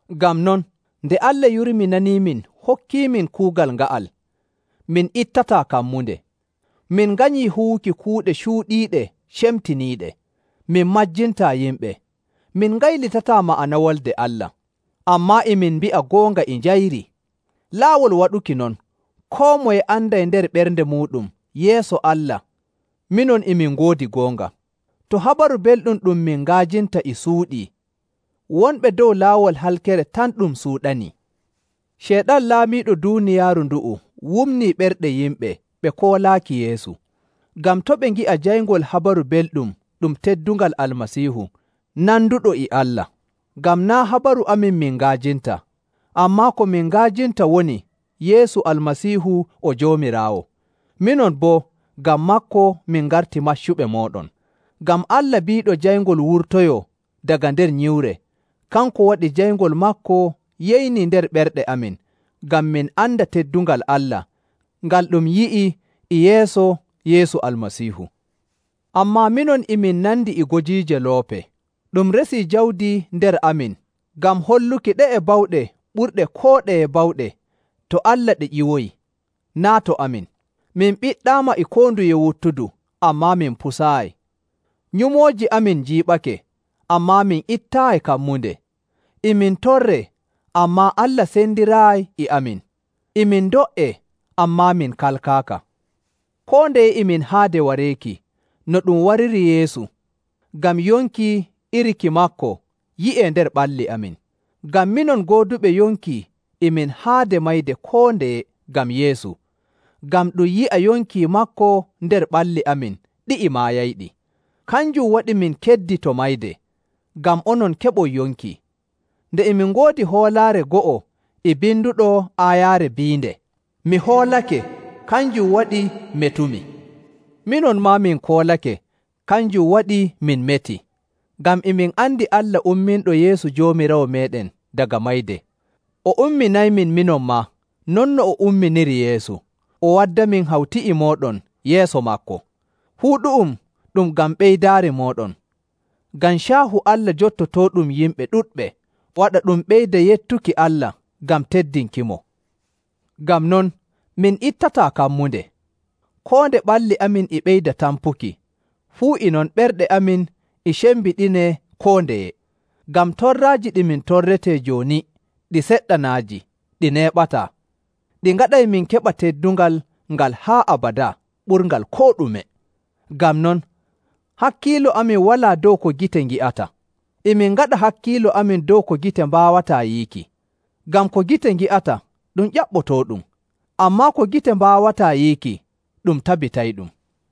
Ngam non, nde Allah yurminaniimin hokkiimin kuugal nga'al, min ittataa kammunde. Min nganyii huwuki kuuɗe cuuɗiiɗe cemtiniiɗe. Min majjintaa yimɓe, min ngaylitataa ma'ana Wolde Allah. Ammaa e min mbi'a goonga e njayri. Laawol waɗuki non, koo moye anday nder ɓernde muuɗum yeeso Allah minon e min ngoodi goonga. To Habaru Belɗum ɗum min nga'ajinta e suuɗii, wonɓe dow laawol halkere tan ɗum suuɗanii. Ceyɗan laamiiɗo duuniyaaru ndu'u wumnii ɓerɗe yimɓe ɓe koolaaki Yeesu, ngam to' ɓe ngi'a jayngol Habaru Belɗum ɗum teddungal Almasiihu nanduɗo e Allah. Ngam naa' habaru amin min nga'ajinta, ammaa ko min nga'ajinta woni Yeesu Almasiihu o Joomiraawo, minon boo ngam maako min ngarti maccuɓe mooɗon. Ngam Allah biiɗo jayngol wurtoyoo daga nder nyiwre, kanko waɗi jayngol maako yeynii nder ɓerɗe amin ngam min anda teddungal Allah ngal ɗum yi'ii e yeeso Yeesu Almasiihu. Ammaa minon e min nandi e gojiije loope. Ɗum resii jawdi nder amin ngam holluki ɗe'e bawɗe ɓurɗe koo ɗeye bawɗe, to Allah ɗe ƴiwoyi, naa' to amin. Min ɓiɗɗaama e koo nduye wuttudu, ammaa min pusaayi. Nyumooji amin njiiɓake, ammaa min ittaayi kammunde. E min torree, ammaa Allah sendiraayi e amin. E min ndo''ee, ammaa min kalkaaka. Koo ndeye e min haade wareeki no ɗum wariri Yeesu, ngam yonki iri ki maako yi'ee nder ɓalli amin. Ngam minon gooduɓe yonki e min haade mayde koo ndeye ngam Yeesu, ngam ɗum yi'a yonki maako nder ɓalli amin ɗi'i maayayɗi. Kanjum waɗi min keddi to mayde, ngam onon keɓon yonki. Nde e min ngoodi hoolaare go'o e binduɗo aayaare biinde, “Mi hoolake, kanjum waɗi metumi.” Minon maa min koolake, kanjum waɗi min meti. Ngam e min andi Allah umminɗo Yeesu Joomiraawo meeɗen daga mayde, o umminaymin minon maa non no o umminiri Yeesu, o waddamin hawti e mooɗon yeeso maako. Fuu ɗu'um ɗum ngam ɓeydaari mooɗon, ngam caahu Allah jottotooɗum yimɓe ɗuɗɓe, waɗa ɗum ɓeyda yettuki Allah ngam teddinkimo. Ngam non, min ittataa kammunde. Koo nde ɓalli amin e ɓeyda tampuki, fuu e non ɓerɗe amin e cembiɗinee koo ndeye. Ngam torraaji ɗi min torretee jooni ɗi seɗɗanaaji ɗi neeɓataa ɗi ngaɗay min keɓa teddungal ngal haa abadaa ɓurngal koo ɗume. Ngam non, hakkiilo amin walaa dow ko gite ngi'ata. E min ngaɗa hakkiilo amin dow ko gite mbaawataa yiiki. Ngam ko gite ngi'ata ɗum ƴaɓɓotooɗum, ammaa ko gite mbaawataa yiiki, ɗum tabitayɗum.